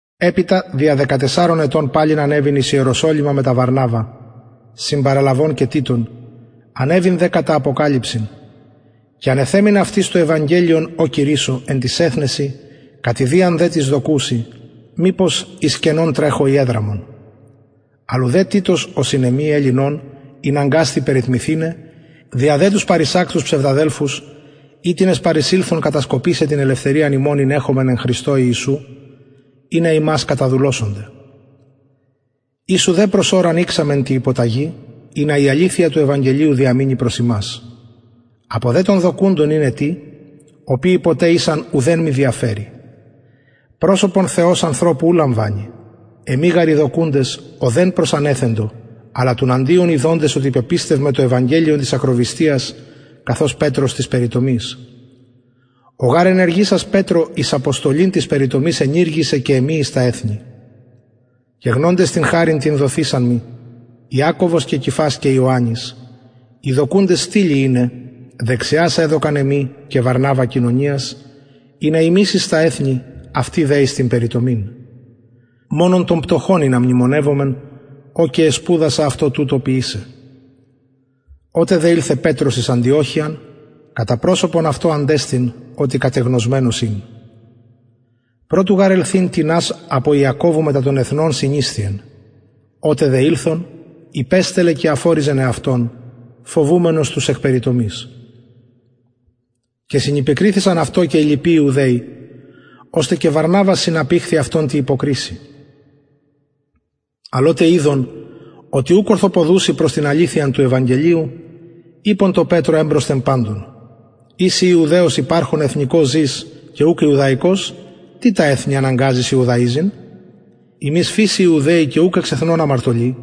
επειτα δια δεκατεσσαρων ετων παλιν ανεβην εις ιεροσολυμα μετα βαρναβα συμπαραλαβων και τιτον ανεβην δε κατα αποκαλυψιν και ανεθεμην αυτοις το ευαγγελιον ο κηρυσσω εν τοις εθνεσιν κατ ιδιαν δε τοις δοκουσιν μηπως εις κενον τρεχω η εδραμον αλλ ουδε τιτος ο συν εμοι ελλην ων ηναγκασθη περιτμηθηναι δια δε τους παρεισακτους ψευδαδελφους οιτινες παρεισηλθον κατασκοπησαι την ελευθεριαν ημων ην εχομεν εν χριστω ιησου ινα ημας καταδουλωσωνται οις ουδε προς ωραν ειξαμεν τη υποταγη ινα η αληθεια του ευαγγελιου διαμεινη προς υμας απο δε των δοκουντων ειναι τι οποιοι ποτε ησαν ουδεν μοι διαφερει προσωπον θεος ανθρωπου ου λαμβανει εμοι γαρ οι δοκουντες ουδεν προσανεθεντο αλλα τουναντιον ιδοντες οτι πεπιστευμαι το ευαγγελιον της ακροβυστιας καθως πετρος της περιτομης ο γαρ ενεργησας πετρω εις αποστολην της περιτομης ενηργησεν και εμοι εις τα εθνη και γνοντες την χαριν την δοθεισαν μοι ιακωβος και κηφας και ιωαννης οι δοκουντες στυλοι ειναι δεξιας εδωκαν εμοι και βαρναβα κοινωνιας ινα ημεις μεν εις τα εθνη αυτοι δε εις την περιτομην μονον των πτωχων ινα μνημονευωμεν ο και εσπουδασα αυτο τουτο ποιησαι οτε δε ηλθεν πετρος εις αντιοχειαν κατα προσωπον αυτω αντεστην οτι κατεγνωσμενος ην προ του γαρ ελθειν τινας απο ιακωβου μετα των εθνων συνησθιεν οτε δε ηλθον υπεστελλεν και αφωριζεν εαυτον φοβουμενος τους εκ περιτομης και συνυπεκριθησαν αυτω και οι λοιποι ιουδαιοι ωστε και βαρναβας συναπηχθη αυτων τη υποκρισει αλλ οτε ειδον οτι ουκ ορθοποδουσιν προς την αληθειαν του ευαγγελιου ειπον τω πετρω εμπροσθεν παντων ει συ ιουδαιος υπαρχων εθνικως ζης και ουκ ιουδαικως τι τα εθνη αναγκαζεις ιουδαιζειν ημεις φυσει ιουδαιοι και ουκ εξ εθνων αμαρτωλοι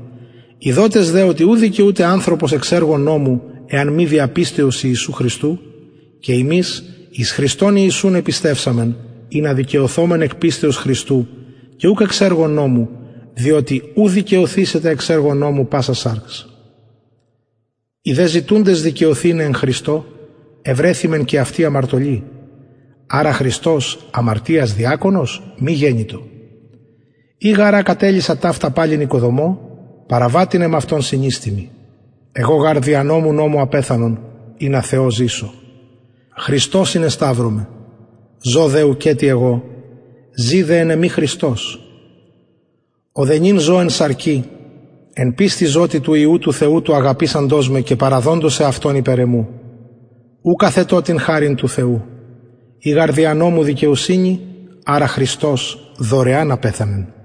ειδοτες οτι ου δικαιουται ανθρωπος εξ εργων νομου εαν μη δια πιστεως ιησου χριστου και ημεις εις χριστον ιησουν επιστευσαμεν ινα δικαιωθωμεν εκ πιστεως χριστου και ουκ εξ εργων νομου διοτι ου δικαιωθησεται εξ εργων νομου πασα σαρξ ει δε ζητουντες δικαιωθηναι εν χριστω ευρεθημεν και αυτοι αμαρτωλοι αρα χριστος αμαρτιας διακονος μη γενοιτο ει γαρ α κατελυσα ταυτα παλιν οικοδομω παραβατην εμαυτον συνιστημι εγω γαρ δια νομου νομω απεθανον ινα θεω ζησω χριστω συνεσταυρωμαι ζω δε ουκετι εγω ζη δε εν εμοι χριστος ο δε νυν ζω εν σαρκι εν πιστει ζω τη του υιου του θεου του αγαπησαντος με και παραδοντος εαυτον υπερ εμου ουκ αθετω την χαριν του θεου ει γαρ δια νομου δικαιοσυνη αρα χριστος δωρεαν απεθανεν